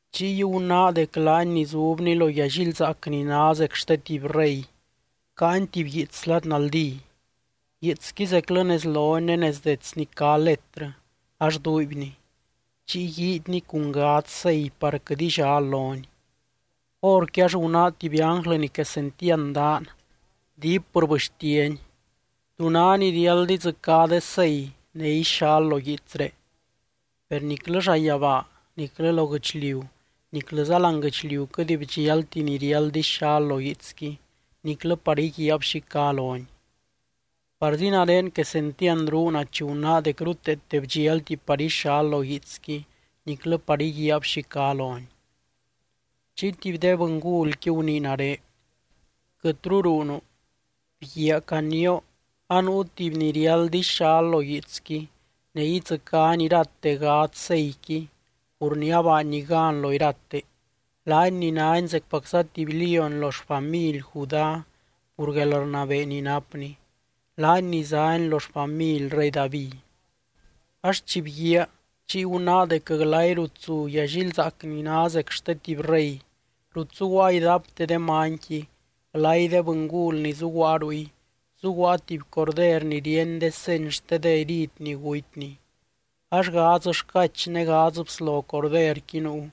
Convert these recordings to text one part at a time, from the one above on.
Chiy gunáa dec laany ni zubny lo yallilzaac ni ná zec xte tuby rey, caany tuby guiits lad naldí. Guiitsqui zeclɨ nez loni ne nez detsni cá letrɨ ax duuibni, chiy guiidyni cun gadz sei par quɨt illal loni. Horqui ax gunáa tuby ánglɨ ni quesentiand daan, diip rbɨxtiany: —¿Tú ná ni riáld idzɨcá de sei ne ixal lo guiitsré? Per niclɨ llayabaa, niclɨ lo guɨchliu, niclɨza láani guɨchliu quɨt bdxialti ni riáld ixal lo guiitsqui, niclɨ par íguiaab xi cá loni. Parzi nare quesentiand ruuna chi gunáa dec ruteete bdxialti par ixal lo guiitsqui niclɨ par íguiaab xi cá loni. Chiy tuby de bɨngulqui gunii nare: —Quɨtru ruunu. Bguiaa canioo, anuu tuby ni riáld ixal lo guiitsqui ne idzɨcány irate gadz seiqui pur ni abaanny gan lo irate, laany ni nány zecpacza tuby lióny lo xfamily Judá pur guelrnabee ni napny, laany ni zány lo xfamily rey David. Ax chi bguíaa, chiy gunáa dec glay rut zu yallilzaac ni ná zec xte tuby rey, rut zuguaa idapte de manyqui, glay de bɨngul ni zuguaa ruy, zuguaa tuby Corder ni ríeny de seny xte de herid ni gutyny. Ax gadz xcach ne gadz bslo Corderqui nuu,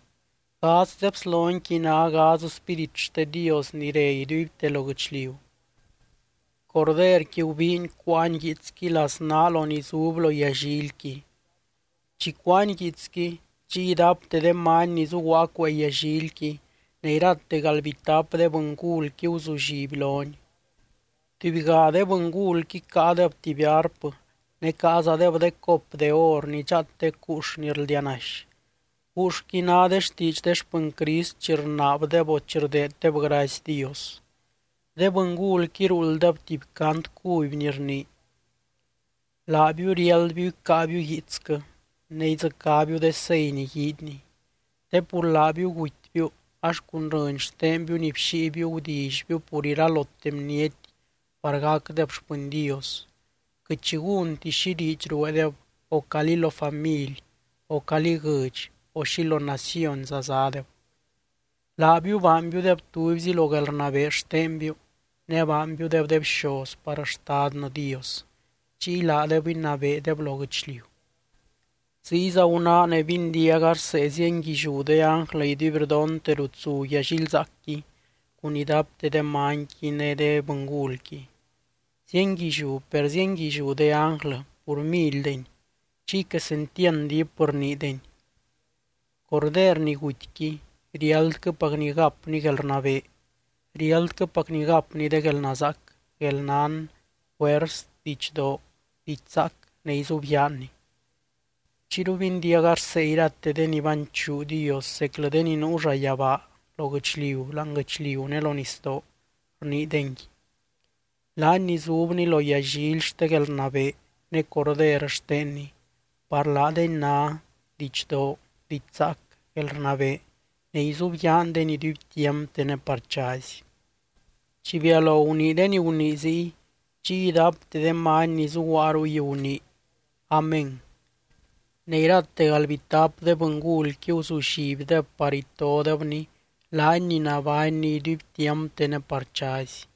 gadz de bslonyqui ná gadz spírit xte Dios ni re iduibte lo guɨchliu. Corderqui gubiiny cuáany guiitsqui laznaa lo ni zub lo yallilqui. Chi cuáany guiitsqui, chiy idapte de many ni zuguaa cuee yallilqui ne irate galdbitap de bɨngulqui guzulliby lony. Tubyga de bɨngulqui caadeb tuby arpɨ ne caazadeb de cop de or ni dxaatec guux ni rldianaxy, guuxqui ná de xtiidx de xpɨny Crist chi rnaabdeb o chi rdeeddeb gracy Dios. De bɨngulqui ruulddeb tuby cant cuby ni rnii: Laabiu riáldbiu icáabiu guiitsquɨ ne idzɨcábiu de sei ni guiidyni. Te pur laabiu gutybiu ax cun rɨny xtenbiu ni bxíibiu gudillybiu pur iralote bniety par gacdeb xpɨny Dios, quɨt xi gúnti xi diidx rueedeb, o calí lo family, o calí guɨdx, o xi lo nacionza zádeb. Laabiu baanbiudeb tubyzi lo guelrnabee xtenbiu ne baanbiudeb de bxoz par Xtadnɨ Dios, chiy laadeb inabeedeb lo guɨchliu. Ziyza gunáa ne bindiaga rsee zienguilliú de ánglɨ iduibrdonte rut zu yallilzaacqui cun idapte de manyqui ne de bɨngulqui. Zienguilliú per zienguilliú de ánglɨqui pur milydeny. Chiy quesentiand diip rniideny: Corder ni gutyqui riáldquɨpacny gapny guelrnabee, riáldquɨpacny gapny de guelnazaac, guelnán, juers, didxdoo, diidx zaac ne izubyaanny. Chiyru bindiaga rsee irate de ni banchuu Dios, zeclɨ de ni nuu llayabaa, lo guɨchliu, láani guɨchliu ne lo nisdoo, rniidengui: Laany ni zubny lo yallily xte guelrnabee ne Corder xtenny, par laadeny ná: Didxdoo, diidx zaac, guelrnabee ne izubyaandeny iduibtiampte ne par chazy. Chi bialo gunii de ni gunii ziy, chiy idapte de many ni zuguaa ruy gunii: —¡Amén! Ne irate galdbitap de bɨngulqui guzullibdeb par itodebny, laany ni nabánny iduibtiampte ne par chazy.